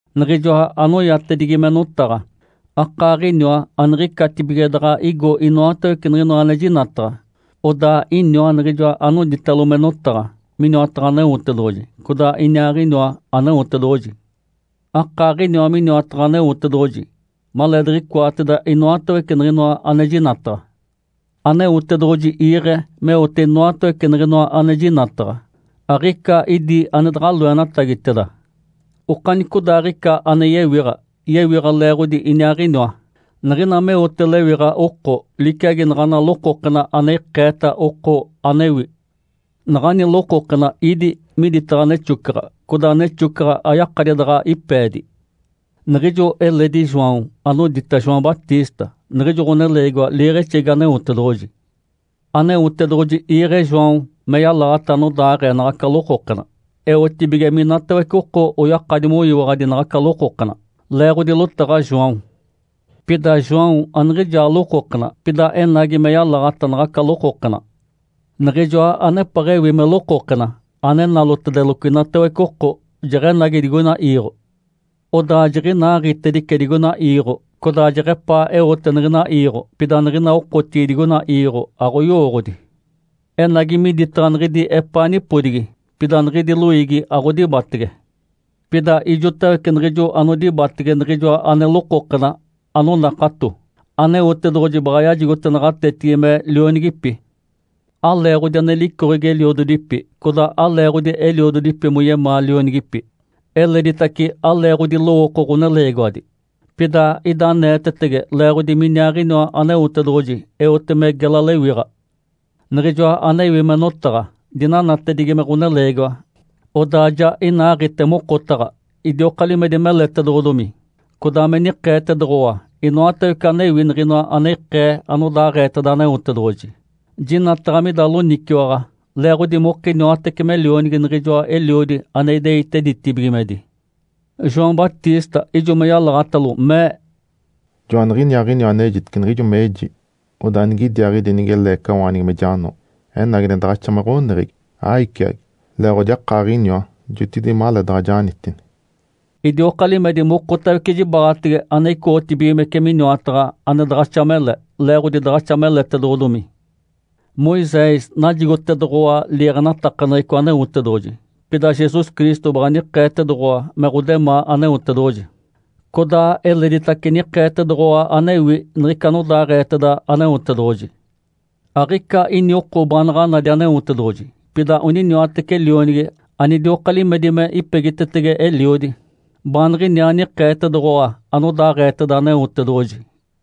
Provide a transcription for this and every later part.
Niɡ̶ijoa anoyatedigi me Notaɡ̶a akaaɡ̶iniwa aniɡ̶icatibige daɡ̶a igo inoatawece niɡ̶inoa ane jinataɡ̶a. Odaa iniwa Niɡ̶ijoa anoditalo me Notaɡ̶a miniwataɡ̶a Aneotedoɡ̶oji, codaa iniaaɡ̶iniwa Aneotedoɡ̶oji. Akaaɡ̶iniwa miniwataɡ̶a Aneotedoɡ̶oji maleediɡ̶icoateda inoatawece niɡ̶inoa ane jinataɡ̶a. Aneotedoɡ̶oji iiɡ̶e meote inoatawece niɡ̶inoa ane jinataɡ̶a. Aɡ̶ica idi ane daɡ̶a loenatagiteda. Okanicodaaɡ̶ica ane yewiɡ̶a, yewiɡ̶a leeɡ̶odi Iniaaɡ̶iniwa. Niɡ̶ina meote lewiɡ̶a oko, liciagi naɡ̶ana lokokena ane ikeeta oko anewi. Naɡ̶ani lokokena ídi miditaɡ̶a nexocaɡ̶a. Codaa nexocaɡ̶a ayakadi daɡ̶a ipeedi. Niɡ̶ijo eledi João anodita João Batista. Niɡ̶ijo ɡ̶oneleegiwa liiɡ̶exegi Aneotedoɡ̶oji. Aneotedoɡ̶oji iiɡ̶e João me yalaɡ̶ata anodaaɡ̶ee naɡ̶aca lokokena, eotibige minatawece oko oyakadi moyiwaɡ̶adi naɡ̶aca lokokena, leeɡ̶odi lotaɡ̶a João. Pida João aniɡ̶ijaa lokokena, pida enagi me yalaɡ̶ata naɡ̶aca lokokena. Niɡ̶ijoa anepeɡ̶ewi me lokokena, ane nalotedeloco inatawece oko, jeɡ̶enagi digoina iiɡ̶o. Odaa jiɡ̶inaaɡ̶itedice digoina iiɡ̶o. Codaa jeɡ̶epaa eote niɡ̶ina iiɡ̶o, pida niɡ̶ina okotigi digoina iiɡ̶o aɡ̶oyowooɡ̶odi. Enagi miditaɡ̶a niɡ̶idi epaa nipodigi, pida niɡ̶idi loiigi aɡ̶odibatege. Pida ijotawece niɡ̶ijo anodibatege Niɡ̶ijoa ane lokokena, anonakato, Aneotedoɡ̶oji baɡ̶a yajigote naɡ̶atetigi me lionigipi. Aleeɡ̶odi ane licoɡ̶egi eliododipi, codaa aleeɡ̶odi eliododipi moyemaa lionigipi, eleditace aleeɡ̶odi lowooko ɡ̶oneleegiwadi, pida ida aneetetege leeɡ̶odi miniaaɡ̶iniwa Aneotedoɡ̶oji eote me gela lewiɡ̶a. Niɡ̶ijoa anewi me Notaɡ̶a dinanatedigi me ɡ̶oneleegiwa, odaa ja inaaɡ̶ite mokotaɡ̶a. Idioka limedi meletedoɡ̶odomi, codaa me nikeetedoɡ̶owa inoatawece anewi niɡ̶inoa ane ikee anodaaɡ̶eeteda Aneotedoɡ̶oji. Jinataɡ̶a mida loniciwaɡ̶a, leeɡ̶odi mokiniwatece me Lionigi niɡ̶ijoa Eliodi ane ideite ditibigimedi. João Batista ijo me yalaɡ̶atalo, mee, “Joaniɡ̶iniaaɡ̶iniwa anejitece niɡ̶ijo meji, ‘Odaa nigidiaaɡ̶idi nige leecawaanigi me jano, enagi ane daɡ̶axa me ɡ̶oneɡ̶egi, aiciagi, leeɡ̶odi akaaɡ̶iniwa jotigide maleedaɡ̶a janitini’”. Idioka limedi mokotawece jibaɡ̶atege ane icoɡ̶otibigimece miniwataɡ̶a ane daɡ̶axa mele, leeɡ̶odi daɡ̶axa meletedoɡ̶odomi. Moisés najigotedoɡ̶owa liiɡ̶enatakaneɡ̶eco Aneotedoɡ̶oji, pida Jesus Cristo baɡ̶a nikeetedoɡ̶owa me ɡ̶odemaa Aneotedoɡ̶oji, codaa eleditace nikeetedoɡ̶owa anewi niɡ̶ica anodaaɡ̶eeteda Aneotedoɡ̶oji. Aɡ̶ica ini oko baanaɡ̶a nadi Aneotedoɡ̶oji. Pida oniniwatece Lionigi anidioka limedi me ipegitetege Eliodi, baaniɡ̶iniaa nikeetedoɡ̶owa anodaaɡ̶eeteda Aneotedoɡ̶oji.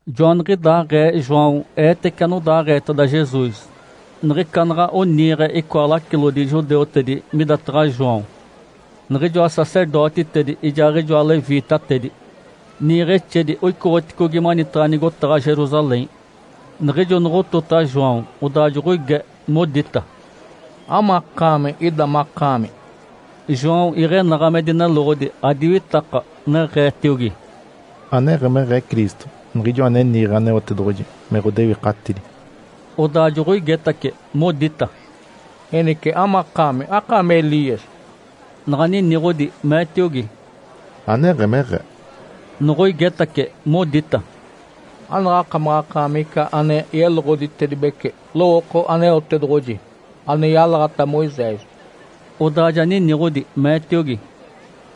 Joaniɡ̶idaaɡ̶ee João eetece anodaaɡ̶eeteda Jesus, niɡ̶ica naɡ̶a oniiɡ̶e icoa lacilodi judeutedi midataɡ̶a João niɡ̶ijoa sacerdotitedi ijaaɡ̶ijoa leviitatedi. Niiɡ̶exedi oicoɡ̶oticogi manitaɡ̶a nigotaɡ̶a Jerusalém. Niɡ̶ijo noɡ̶otota João, odaa joɡ̶oige modita, “Amakaami ida makaami?” João iɡ̶enaɡ̶a me dineloɡ̶odi, adiwitaka, neɡ̶eetiogi, “Aneɡ̶emeɡ̶ee Cristo, Niɡ̶ijoa ane niiɡ̶e Aneotedoɡ̶oji me ɡ̶odewikatidi”. Odaa joɡ̶oigetace, modita, “Enice, amakaami? Akaami Elias?” Naɡ̶a niniɡ̶odi meetiogi, “Aneɡ̶emeɡ̶ee”. Noɡ̶oigetace, modita, “Anaɡ̶akamaɡ̶akaami ica ane yeloɡ̶oditedibece lowooko Aneotedoɡ̶oji, ane yalaɡ̶ata Moisés?” Odaa ja niniɡ̶odi meetiogi,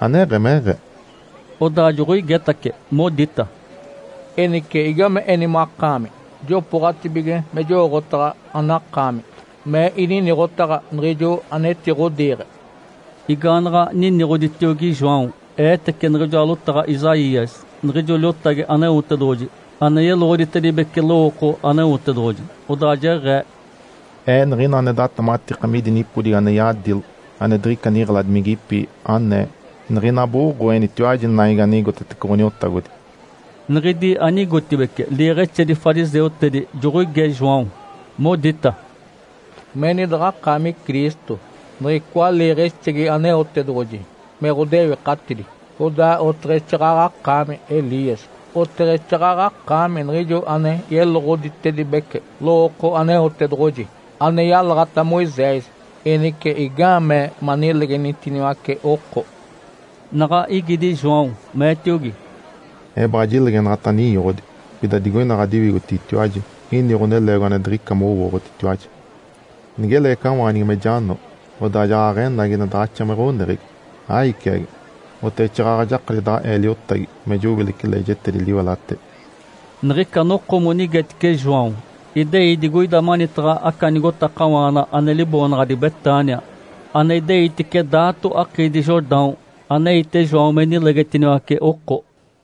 “Aneɡ̶emeɡ̶ee”. Odaa joɡ̶oigetace, modita, “Enice igame eni makaami? Jopooɡ̶atibige me jowooɡ̶otaɡ̶a anakaami me ininiɡ̶otaɡ̶a niɡ̶ijo anetiɡ̶odiiɡ̶e”. Igaanaɡ̶a niniɡ̶oditiogi João, eetece niɡ̶ijoa lotaɡ̶a Isaías, niɡ̶ijo liotagi Aneotedoɡ̶oji ane yeloɡ̶oditedibece lowooko Aneotedoɡ̶oji. Odaa jeɡ̶ee, “Ee niɡ̶ina ane datematika midi nipodigi ane yadilo, ane diɡ̶ica niɡ̶eladimigipi, anee, ‘Niɡ̶ina boɡ̶oenitiwaji naigi ane igotetece Ǥoniotagodi’”. Niɡ̶idi ane igotibeci liiɡ̶exedi fariseutedi joɡ̶oige João, Modita, “Meni daɡ̶akaami Cristo, niɡ̶icoa liiɡ̶exegi Aneotedoɡ̶oji me ɡ̶odewikatidi, codaa oteɡ̶exaaɡ̶aɡ̶a akaami Elias, oteɡ̶exaaɡ̶aɡ̶a akaami niɡ̶ijo ane yeloɡ̶oditedibece lowooko Aneotedoɡ̶oji, ane yalaɡ̶ata Moisés. Enice, igaamee manilegenitiniwace oko?” Naɡ̶a igidi João, meetiogi, “Ee baɡ̶a jilegenaɡ̶ata ninyoɡ̶odi. Pida digoina ɡ̶adiwigotigitiwaji ini ɡ̶oneleegiwa ane diɡ̶ica mowooɡ̶otitiwaji. Nige leecawaanigi me jano, odaa jaɡ̶aɡ̶enagi ane daɡ̶axa me ɡ̶oneɡ̶egi, aiciagi, oteɡ̶exaaɡ̶aɡ̶a jakadi daɡ̶a ee liotagi me jowilece leejetedi liwelatedi”. Niɡ̶ica noko monigetice João idei digoida manitaɡ̶a aca nigotakawaana ane liboonaɡ̶adi Betânia, ane ideitice daato akiidi Jordão, aneite João me nilegetiniwace oko.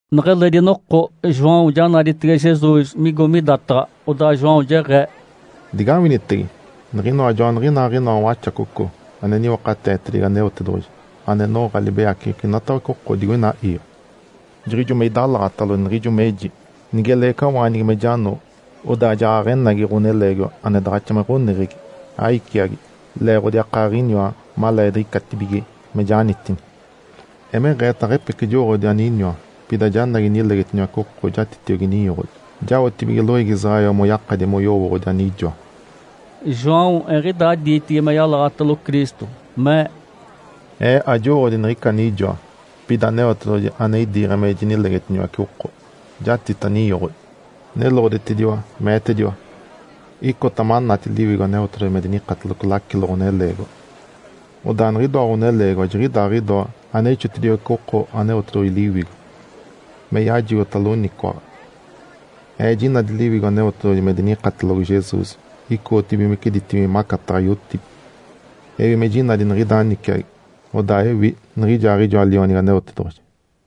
Neɡ̶eledi noko João ja naditege Jesus migo midataɡ̶a. Odaa João jeɡ̶ee, “Digawinitege! Niɡ̶inoa joaniɡ̶inaaɡ̶inoa Waxacoco ane niwakateetedigi Aneotedoɡ̶oji, ane noɡ̶a libeyaceɡ̶eco inatawece oko digoina iiɡ̶o. Jiɡ̶ijo me idalaɡ̶atalo, niɡ̶ijo meji, ‘Nige leecawaanigi me jano, odaa jaɡ̶aɡ̶enagi ɡ̶oneleegiwa ane daɡ̶axa me ɡ̶oneɡ̶egi, aiciagi, leeɡ̶odi akaaɡ̶iniwa maleediɡ̶icatibige me janitini’. Emeɡ̶eeta aɡ̶epece jowooɡ̶odi aniniwa. Pida janagi inilegetiniwace oko jatitiogi ninyoɡ̶odi, jaotibige loiigi Israel moyakadi moyowooɡ̶odi anijoa”. João eɡ̶idaa diitigi me yalaɡ̶atalo Cristo, mee, “Ee ajowooɡ̶odi niɡ̶ica anijoa. Pida Aneotedoɡ̶oji, ane idiiɡ̶e me jinilegetiniwace oko, jatita ninyoɡ̶odi, neloɡ̶otediwa, meetediwa, ‘Icota manati Liwigo Aneotedoɡ̶oji me dinikateloco lacilo ɡ̶oneleegiwa. Odaa niɡ̶idoa ɡ̶oneleegiwa jiɡ̶idaaɡ̶idoa ane ixotediwece oko Aneotedoɡ̶oji Liwigo me yajigota loniciwaɡ̶a’. Ee jinadi Liwigo Aneotedoɡ̶oji me dinikatelogo Jesus icoɡ̶otibigimece ditibigimedi macataɡ̶a yotibi. Ewi me jinadi niɡ̶ida niciagi, odaa ewi niɡ̶ijaaɡ̶ijoa Lionigi Aneotedoɡ̶oji”.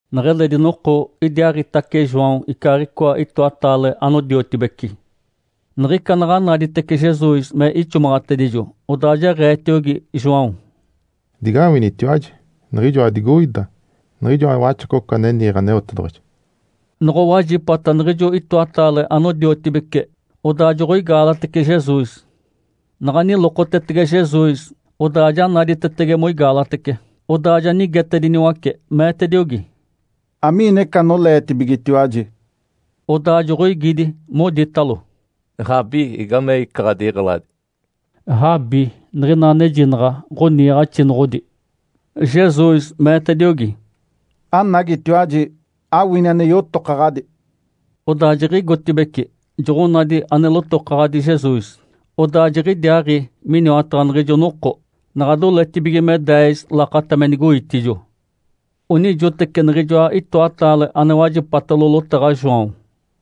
Neɡ̶eledi noko, idiaaɡ̶itace João icaaɡ̶icoa itoataale anodiotibeci. Niɡ̶ica naɡ̶a naditece Jesus me ixomaɡ̶atedijo, odaa jeɡ̶eetiogi João, “Digawinitiwaji. Niɡ̶ijoa digoida, niɡ̶ijoa Waxacoco ane niiɡ̶e Aneotedoɡ̶oji”. Noɡ̶owajipata niɡ̶ijo itoataale anodiotibeci, odaa joɡ̶oigaalatece Jesus. Naɡ̶a nilokotetege Jesus, odaa ja naditetege moigaalatece. Odaa ja nigetediniwace, meetediogi, “Amiina ica anoleetibigetiwaji?” Odaa joɡ̶oigidi moditalo, “Rabi, igamei ica ɡ̶adiɡ̶eladi?” (“Rabi” niɡ̶ina anejinaɡ̶a “Ǥoniiɡ̶axinoɡ̶odi”.) Jesus meetediogi, “Anagitiwaji, awini ane yotokaɡ̶adi”. Odaa jiɡ̶igotibeci, joɡ̶onadi ane lotokaɡ̶adi Jesus. Odaa jiɡ̶idiaaɡ̶i miniwataɡ̶a niɡ̶ijo noko. Naɡ̶a doletibige me deez lakata me nigoitijo. Onijoteci niɡ̶ijoa itoataale ane wajipatalo lotaɡ̶a João,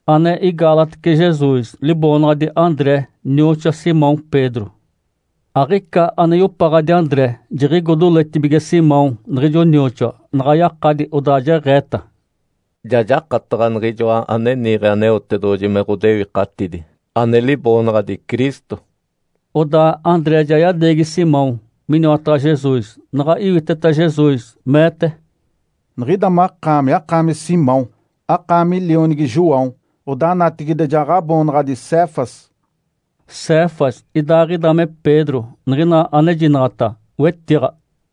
ane igaalatece Jesus, liboonaɡ̶adi André, nioxoa Simão Pedro. Aɡ̶ica ane yopaɡ̶adi André jiɡ̶igo doletibige Simão niɡ̶ijo nioxoa. Naɡ̶a yakadi, odaa jeɡ̶eeta, “Ja jakataɡ̶a Niɡ̶ijoa ane niiɡ̶e Aneotedoɡ̶oji me ɡ̶odewikatidi, ane liboonaɡ̶adi Cristo.” Odaa André ja yadeegi Simão miniwataɡ̶a Jesus. Naɡ̶a iwiteta Jesus, meete, “Niɡ̶ida makaami akaami Simão, akaami lionigi João. Odaa natigide ja ɡ̶aboonaɡ̶adi Cefas”. (“Cefas” idaaɡ̶ida me “Pedro”, niɡ̶ina anejinaɡ̶ata “wetiɡ̶a”.)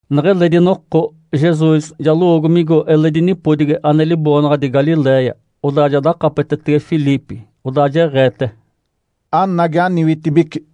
Neɡ̶eledi noko, Jesus ja lowoogo migo eledi nipodigi ane liboonaɡ̶adi Galiléia. Odaa ja dakapetetege Filipe, odaa jeɡ̶eete, “Anagi, aniwitibici!”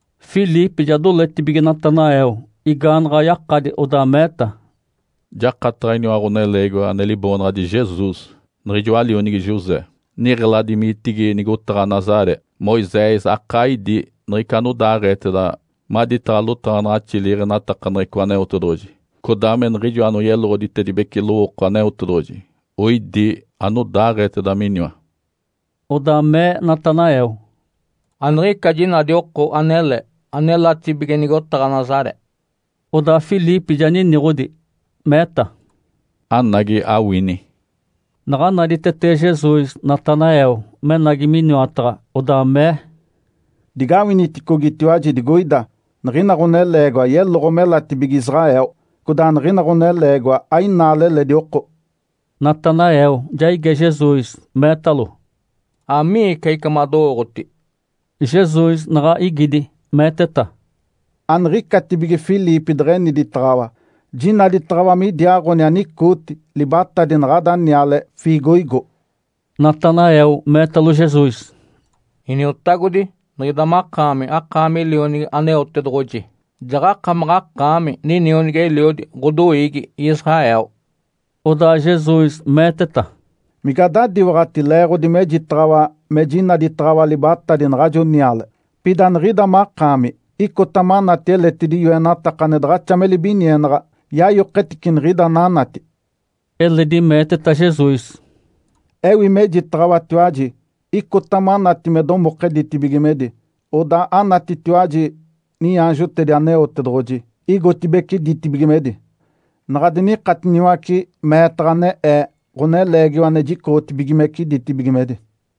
Filipe ja doletibige Natanael, igaanaɡ̶a yakadi, odaa meeta, “Jakataɡ̶a iniwa ɡ̶oneleegiwa ane liboonaɡ̶adi Jesus, niɡ̶ijoa lionigi José, niɡ̶elademigitigi nigotaɡ̶a Nazaré. Moisés akaa idí niɡ̶ica anodaaɡ̶eeteda maditaɡ̶a lotaɡ̶anaɡ̶axi liiɡ̶enatakaneɡ̶eco Aneotedoɡ̶oji, codaa me niɡ̶ijo anoyeloɡ̶oditedibece lowooko Aneotedoɡ̶oji oidi anodaaɡ̶eeteda miniwa.” Odaa mee Natanael, “Aniɡ̶ica jinadi oko anele anelatibige nigotaɡ̶a Nazaré”. Odaa Filipe ja niniɡ̶odi, meeta, “Anagi, awini”. Naɡ̶a naditetege Jesus Natanael menagi miniwataɡ̶a, odaa mee, “Digawiniticogitiwaji digoida. Niɡ̶ina ɡ̶oneleegiwa yeloɡ̶o melatibige Israel, codaa niɡ̶ina ɡ̶oneleegiwa ainaale eledi oko”. Natanael ja ige Jesus, meetalo, “Amiica ica madowooɡ̶oti?” Jesus naɡ̶a igidi, meeteta, “Aniɡ̶icatibige Filipe deɡ̶eniditaɡ̶awa, jinaditaɡ̶awa midiaaɡ̶oni anicooti libatadi naɡ̶ada niale ‘fiigoigo’”. Natanael meetalo Jesus, “Iniotagodi, niɡ̶ida makaami, akaami Lionigi Aneotedoɡ̶oji, jaɡ̶akamaɡ̶akaami ninionigi-eliodi ɡ̶odoiigi Israel”. Odaa Jesus meeteta, “Mige adadiwaɡ̶ati leeɡ̶odi mejitaɡ̶awa me jinaditaɡ̶awa libatadi naɡ̶ajo niale? Pida niɡ̶ida makaami icota manati eletidi yoenataka ane daɡ̶axa me libinienaɡ̶a yayoketice niɡ̶ida ananati”. Eledi meeteta Jesus, “Ewi mejitaɡ̶awatiwaji, icota manati me domoke ditibigimedi, odaa anatitiwaji niaanjotedi Aneotedoɡ̶oji igotibeci ditibigimedi, naɡ̶a dinikatiniwace meetaɡ̶a ane Ee, Ǥoneleegiwa ane jicoɡ̶otibigimece ditibigimedi”.